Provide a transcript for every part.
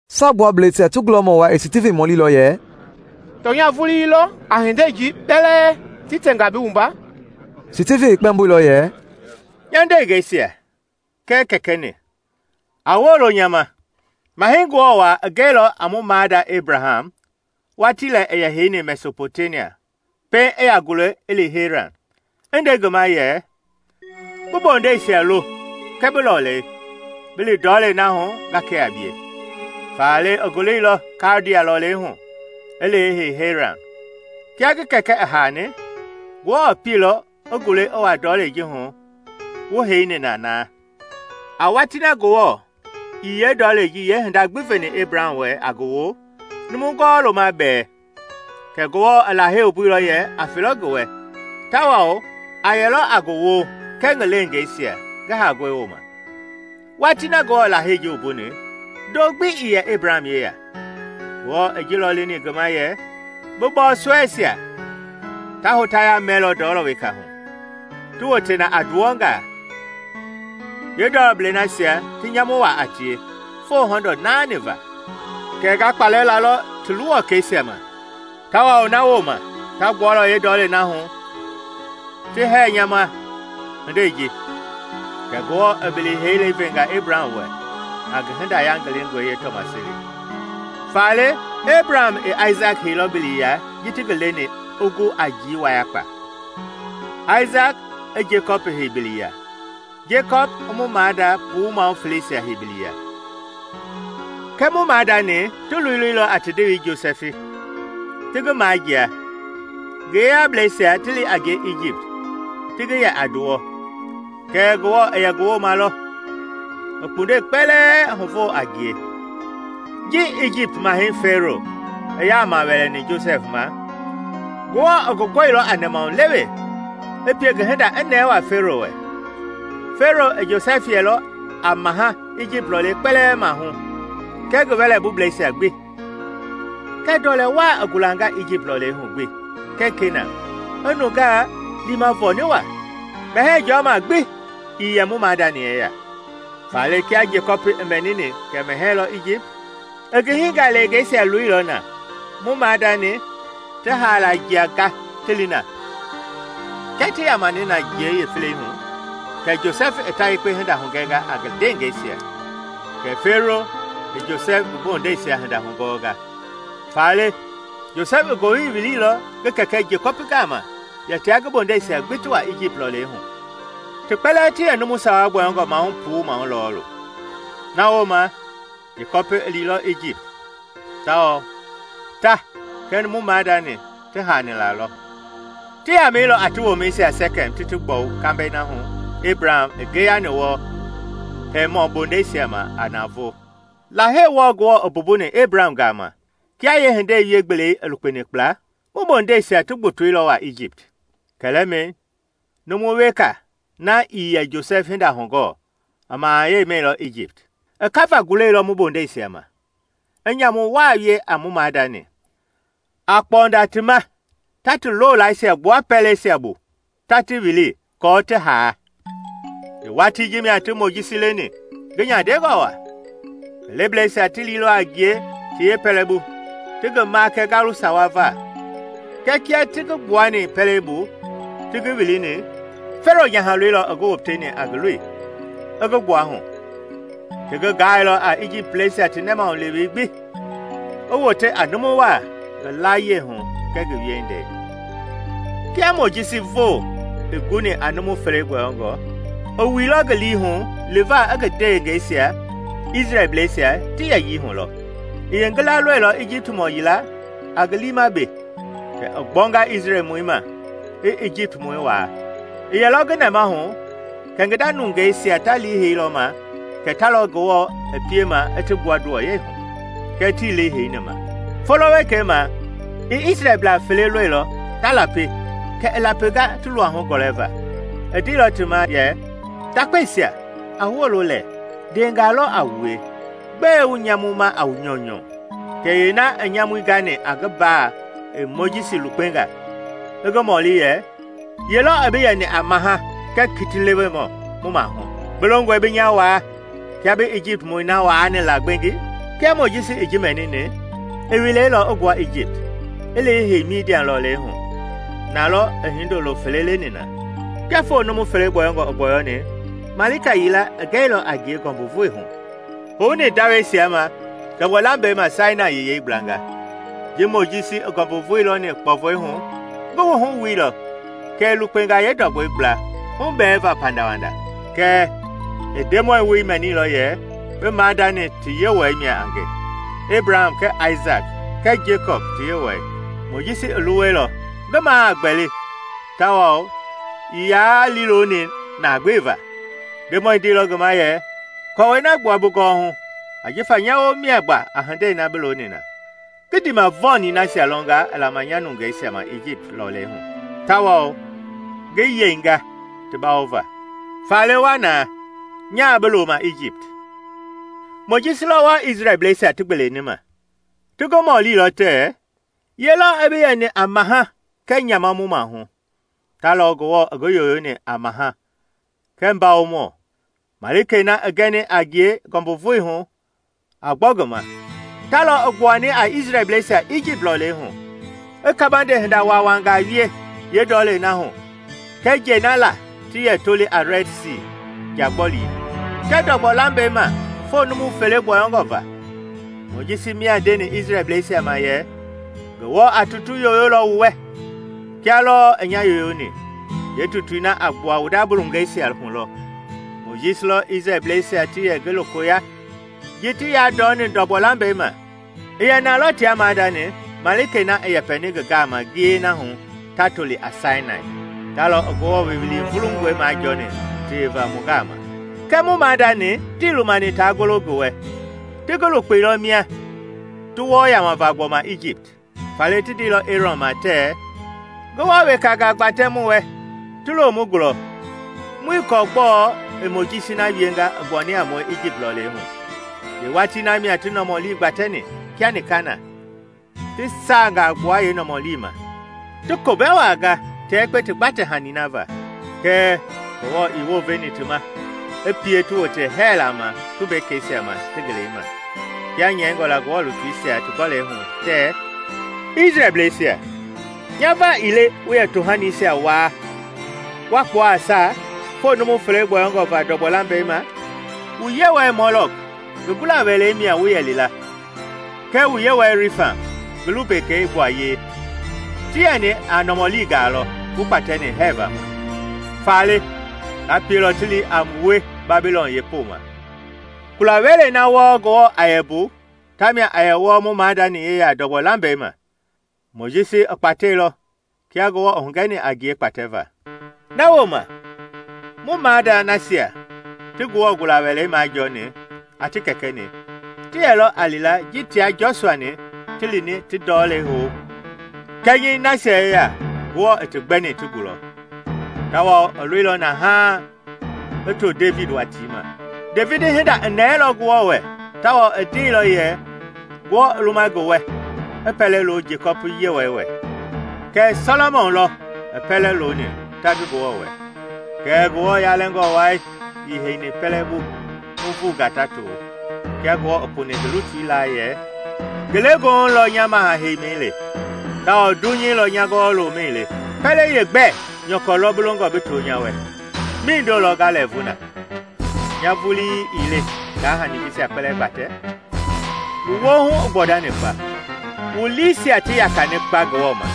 Saagbuablɛisia ti gulɔmɔ wai i Stivin mɔlilɔ yɛ, “Tɔnya vulii lɔ a hindei ji kpɛlɛɛ ti tɛnga bi wumba?” Stivin i kpɛmboilɔ yɛ, “Nya ndeengɛisia kɛɛ kɛkɛ-ni! A wolo nya ma! Mahɛi Ngewɔ Waa i gɛilɔ a mu maada Ebraham watii lɛ i yɛ heini Mesɔpɔtemia pɛiŋ i yaa gule i li Heran, i nde ngi ma yɛ, ‘Bi bondeisia lo kɛɛ bi lɔlei, bi li ndɔlei na hu nga kɛ a bie.’ Faale i guleilɔ Kaldia lɔlei hu i li i hei Heran. Kia ngi kɛkɛ i haani, Ngewɔ pieilɔ i gule i wa ndɔlei ji hu wu heini na na. A watii na Ngewɔ ii yeendɔlɛi ji yeehinda gbi veni Ebraham wɛ a ngi woo, numu gɔwɔ-loma bɛɛ; kɛɛ Ngewɔ i Lahei wumbuilɔ yɛ a felɔ ngi wɛ, tawao a yɛlɔ a ngi woo kɛɛ ngi leengeisia ngi haangɔi wooma. Watii na Ngewɔ i Lahei ji wumbuni, ndo gbi ii yɛ Ebraham yeya. Ngewɔ i ji lɔ leni ngi ma yɛ, ‘Bi bɔɔsɔɛisia ta hotaya mɛlɔ ndɔlɔ weka hu, ti wote na a nduwɔngaa, yeendɔlɔblei nasia ti nyamu waa a tie foo hɔndɔɔ naani va. Kɛɛ nga kpalɛ lalɔ ti luwɔkɛisia ma, tawao na wooma ta gbualɔ yeendɔlei na hu ti hɛɛ nya ma hindei ji.’ Kɛ Ngewɔ i bili heilɛi venga Ebraham wɛ a ngi hinda yangilingɔi yeetɔmaseli. Faale Ebraham i Aisaki heiilɔ biliya ji ti ngi leni i gu a njii wayakpa; Aisaki i Jekɔpi hei biliya, Jekɔpi i mu maada puu maahu feleisia hei biliya. “Kɛɛ mu maadani ti loleilɔ a ti ndewei Josɛfi, ti ngi majia, ngi yeyablɛisia ti li a ngie Ijipt ti ngi yɛ a nduwɔ. Kɛɛ Ngewɔ i yɛ ngi wooma lɔ, i kpundɛi kpɛlɛɛ huvo a ngie. Ji Ijipt Mahɛi Fɛɛro i yaama wɛlɛni Josɛfi ma, Ngewɔ i ngi gɔilɔ a nɛmahulewe, i pie ngi hinda i nɛɛ waa Fɛɛro wɛ. Fɛɛro i Josɛfi yɛilɔ a maha Ijipt lɔlei kpɛlɛɛ maahu kɛɛ ngi wɛlɛbubleisia gbi. Kɛ ndɔlɛ waa i gulanga Ijipt lɔlei hu gbi kɛɛ Kenaan, i nungaa liima vɔɔni waa. Mɛhɛɛ jɔma gbi ii yɛ mu maadani yeya. Faale kia Jekɔpi i mɛnini kɛ mɛhɛɛ lɔ Ijipt, i ngi hingaleengeisia loilɔ na, mu maadani, ti haala jia ga ti li na. Kia ti yamani na jiei yeefelei hu, kɛ Josɛfi i ta yekpe hinda hugɛnga a ngi ndeengɛisia, kɛ Fɛɛro i Josɛfi ngi bondeisia hinda hugɔɔnga. Faale Josɛfi i ngowili wiliilɔ ngi kɛkɛ Jekɔpi gama yɛ tia ngi bondeisia gbi ti wa Ijipt lɔlei hu: ti kpɛlɛɛ ti yɛ numu sawa gbɔyɔngɔ maahu puu maahu lɔɔlu. Na wooma Jekɔpi i liilɔ Ijipt, tawao ta kɛɛ mu maadani ti haani na lɔ. Ti yamɛilɔ a ti womɛisia Sɛkɛm ti ti gbɔwu kambɛi na hu Ebraham i ngeyani wɔɔ Hemɔ bondeisia ma a navoo. “Lahei wɔɔ Ngewɔ i mbumbuni Ebraham gama, kia yeehindei wie-gbelei i lukpeni kpla, mu bondeisia ti gbotoilɔ waa Ijipt. Kɛlɛmɛi numu weka, na ii yɛ Josɛf hinda hugɔɔ i mahayɛi mɛilɔ Ijipt. I kava gulɛilɔ mu bondeisia ma, i nyamu waa wie a mu maadani, a kpɔnda ti ma ta ti loolaaisia gbua pɛleisia bu ta ti wili aako ti haa. Yeewatii ji mia ti Mojisi leni, ngi nyandengɔ waa. Ngi lebleisia ti liilɔ a ngie ti yeepɛlɛbu ti ngi makɛ ngalu sawa va, kɛɛ kia ti ngi gbuani pɛlei bu ti ngi wilini, Fɛɛro nyahaloi lɔ i ngi woteni a ngi loi, i ngi gbuahu. Ti ngi gaailɔ a Ijiptblɛisia ti nɛmahulewei gbi, i wote a numu waa ngi layie hu kɛɛ ngi wiehindei. “Kia Mojisi voo i guni a numu fele gbɔyɔngɔ, i wuilɔ ngi lii hu liva i ngi ndeengɛisia, Isrɛlbleisia, ti yɛyii hulɔ. I yeengila lɔilɔ Ijiptmɔ yila a ngi liima be, kɛ i gbɔnga Isrɛlmɔi ma, i Ijiptmɔi waa. (I yɛlɔ ngi nɛmahu kɛ ngi nda nungeisia ta liiheilɔ ma kɛ ta lɔ Ngewɔ i piema i ti gbua nduwɔyɛi hu, kɛɛ tii liiheini ma.) Folo wekei ma i Isrɛlblaa fele lɔilɔ ta lapi kɛ i lapinga ti luahu gɔlɛva. I ndeilɔ ti ma yɛ, ‘Ndakpeisia, a wolo lɛɛ, ndeengaa lɔ a wue; gbɛe wu nyamuma a wu nyɔunyɔ?’ Kɛ yeena i nyamui gani a ngi mbaa i Mojisi lukpenga, i ngi mɔli yɛ, ‘Ye lɔ i bi yɛni a maha kɛɛ kitilewemɔ mu maahu? Bi longɔe bi nya waa kia bi Ijiptmɔi na waani la gbengi?’ Kia Mojisi i ji mɛnini, i wilɛilɔ i gbua Ijipt i li i hei Midian lɔlei hu. Na lɔ i hindolo fele leni na. “Kia foo numu fele gbɔyɔngɔ i gbɔyɔni, malika yila i gɛilɔ a ngie ngɔmbuvoi hu i houni ndawɛisia ma ndɔgbɔ lambɛi ma Sainai Yɛyei gblanga. Ji Mojisi i ngɔmbuvoi lɔni kpɔvɔi hu, ngi wuhu wuilɔ, kɛ i lukpenga yeendɔgbɔi gbla hubɛɛva pandawanda. Kɛɛ i Ndemɔi woi mɛnilɔ yɛ: ‘Bi maadani ti Yewɔɛi mia a nge, Ebraham kɛɛ Aisaki kɛɛ Jekɔpi ti Yewɔɛi.’ Mojisi i luwɛilɔ ngi maa a gbɛli tawao ii yaa liiloni na gbeva. Ndemɔi ndeilɔ ngi ma yɛ, ‘Kɔɔwɛi na gbua bi gɔwɔhu ajifa nya woo mia gba a hindei na bi looni na. Ngi ndiimavɔɔni nasia lɔnga i lama nya nungeisia ma Ijipt lɔlei hu tawao ngi yeinga ti bawova. Faale wa na, nyaa bi loma Ijipt.’ “Mojisi lɔ wɔɔ Isrɛlbleisia ti gbeeleni ma. Ti ngi mɔlilɔ tɛɛ, ‘Ye lɔ i bi yɛni a Maha kɛɛ nyama mu maahu?’ Ta lɔ Ngewɔ i ngi yoyoni a maha kɛɛ mbawomɔ, Malikei na i gɛni a ngie ngɔmbuvoi hu a gbɔ ngi ma. Ta lɔ i gbuani a Isrɛlbleisia Ijipt lɔlei hu, i kabande hinda waawangaa wie yeendɔlei na hu kɛɛ njɛi na laa ti yɛ toli a Rɛd Sii (Nja Gbɔlii) kɛɛ ndɔgbɔ lambɛi ma foo numu fele gbɔyɔngɔ va. Mojisi mia ndeni Isrɛlbleisia ma yɛ, ‘Ngewɔ a tutu yoyolɔ wu wɛ, kia lɔɔ i nya yooyoni, yeetutui na a gbua wu nda nungeisia hu lɔ.’ Mojisi lɔ Isrɛlbleisia ti yɛ ngi lokoya ji ti yandɔni ndɔgbɔ lambɛi ma: i yɛ na lɔ tia maadani Malikei na i yɛpɛni ngi gama ngiyei na hu ta toli a Sainai; ta lɔ i Ngewɔ woowili vulungɔi majɔɔni teweva mu gama. “Kɛɛ mu maadani tii lumani taa golo ngi wɛ; ti ngi lukpeilɔ mia, ti wɔɔ yamava gbɔma ijipt. Faale ti ndeilɔ Eerɔn ma tɛɛ, ‘Ngewɔ wekangaa gbatɛ mu wɛ ti lo mu gulɔ. Muii kɔɔ gbɔɔ i Mojisi na wienga i gbuani a mue Ijipt lɔlei hu.’ Yeewatii na mia ti nɔmɔlii gbatɛni kia nika na, ti saangaa gbua yee nɔmɔli ma, ti komɛ waa ga tia yekpe ti gbatɛ-hani na va. Kɛɛ Ngewɔ i wounveilɔ ti ma, i pie ti wote hɛɛla ma tumbekeisia ma ti ngelei ma, kia nyɛingɔ la Ngewɔ lutuisia ti gɔlɛi hu tɛɛ, ‘Isrɛlbleisia! Nya va ii le wu yɛ tohanisia waa wa kpua a saa foo numu fele gbɔyɔngɔ va ndɔgbɔ lambɛi ma. Wu yewɔɛi Molɔk ngi gula-welei mia wu yɛ li la, kɛɛ wu yewɔɛi Rifan ngi lumbekei gbuayei; ti yɛni a nɔmɔlingaa lɔ wu kpatɛni hɛɛva ma. Faale, nga pielɔ ti li a wue Babilɔn yeepoma.’ “Kula-wɛlei na wɔɔ Ngewɔ a yɛ mbu tamia a yɛ wɔɔ mu maadani yeya ndɔgbɔ lambɛi ma. Mojisi i kpateilɔ kia Ngewɔ i hugɛni a ngie kpatɛva. Na wooma mu maada nasia ti Ngewɔ gula-wɛlei majɔɔni a ti kɛkɛ-ni ti yɛlɔ a li la ji tia Jɔsua-ni ti lini ti ndɔlei hou kɛnyɛi nasia yeya Ngewɔ i ti gbɛni ti gulɔ. Tawao i loilɔ na haaŋ i to Devidi watii ma. Devidi hinda i nɛɛlɔ Ngewɔ wɛ tawao i ndeilɔ yɛ Ngewɔ i luma ngi wɛ i pɛlɛ lo Jekɔpi Yewɔɛi wɛ. Kɛɛ Sɔlɔmɔn lɔ i pɛlɛ loni ta ngi Ngewɔ wɛ. “Kɛɛ Ngewɔ Yalɛngɔ Wai ii heini pɛlɛ bu nuuvungaa ta to, kia Ngewɔ i puni ngi lutui laa yɛ, ‘Ngelegoohu lɔ nya Maha heimi le, tawao dunyei lɔ nya gɔwɔ-lomɛi le. Pɛlei yeegbɛ nyɔkɔ lɔ bi longɔ bi too nya wɛ? Mindo lɔ nga lɛɛvu na? Nya vulii ii le ngaa hani jisia kpɛlɛɛ gbatɛ?’ “Wu woohu i gbɔndani kpa! Wu liisia ti yakani kpa Ngewɔ ma,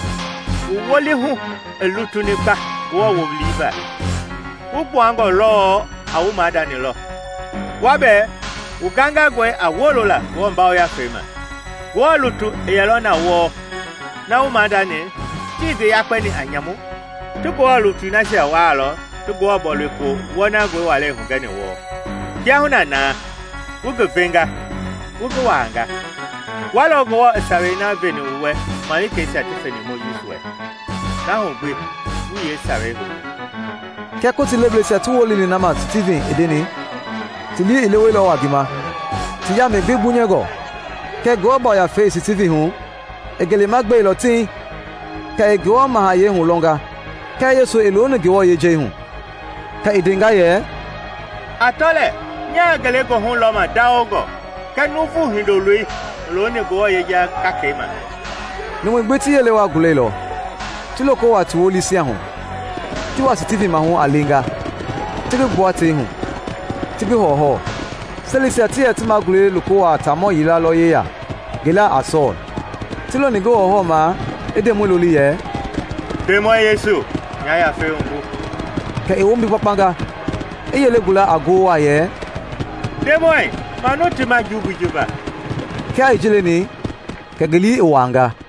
wu wolihu i lutuni kpa Ngewɔ woowili va! Wu gbuangɔ lɔɔ a wu maadani lɔ: wua bɛɛ wu gangangɔe a wolola Ngewɔ Yafei ma! Ngewɔ lutu i yɛlɔ na wɔɔ na wu maadani tii ngi yakpɛni a nyamu? Ti Ngewɔ lutui nasia waalɔ ti Ngewɔ Bɔilopo wɔnangɔi walei hugɛni wɔɔ. Kiahuna na wu ngi venga, wu ngi waanga. Wua lɔ Ngewɔ i sawei na veni wu wɛ malikeisia ti feni Mojisi wɛ -- na hu gbi wuii yeesawei houni!” Kia Kotii lebleisia ti woloni na gbi ma Stivin i ndeni, ti lii i leweilɔ waa ngi ma, ti yaamɛi gbi gbunyɛngɔ. Kɛɛ Ngewɔ Yafei i Stivin hu, i ngelema gbeilɔ tiŋ kɛ i Ngewɔ mahayɛi hulɔnga kɛɛ Yesu i looni Ngewɔ yejei hu. Kɛ i ndenga yɛ, “A tɔ lɛɛ! Nyaa ngelegoohu lɔma ndawongɔ kɛɛ Nuuvu Hindoloi i looni Ngewɔ yeja gakei ma!” Numui gbi ti yele waa gulɛilɔ, ti loko wuaa ti wolisia hu, ti wa Stivin maahu a leenga, ti ngi gbua tei hu, ti ngi hɔwɔhɔwɔ. Selisia ti yɛ ti magulɛisia loko wuaa taamɔ yila lɔ yeya ngi laa a Sɔɔl. Ti loni ngi hɔwɔhɔwɔmaa i Ndemɔi loli yɛ, “Ndemɔi Yesu, nya yafei wumbu!” Kɛ i wombi gbakpanga, i yele gula a ngoo waa yɛ, “Ndemɔi, manu ti ma jumbui ji va!” Kia i ji leni kɛ ngi lii i wuaanga.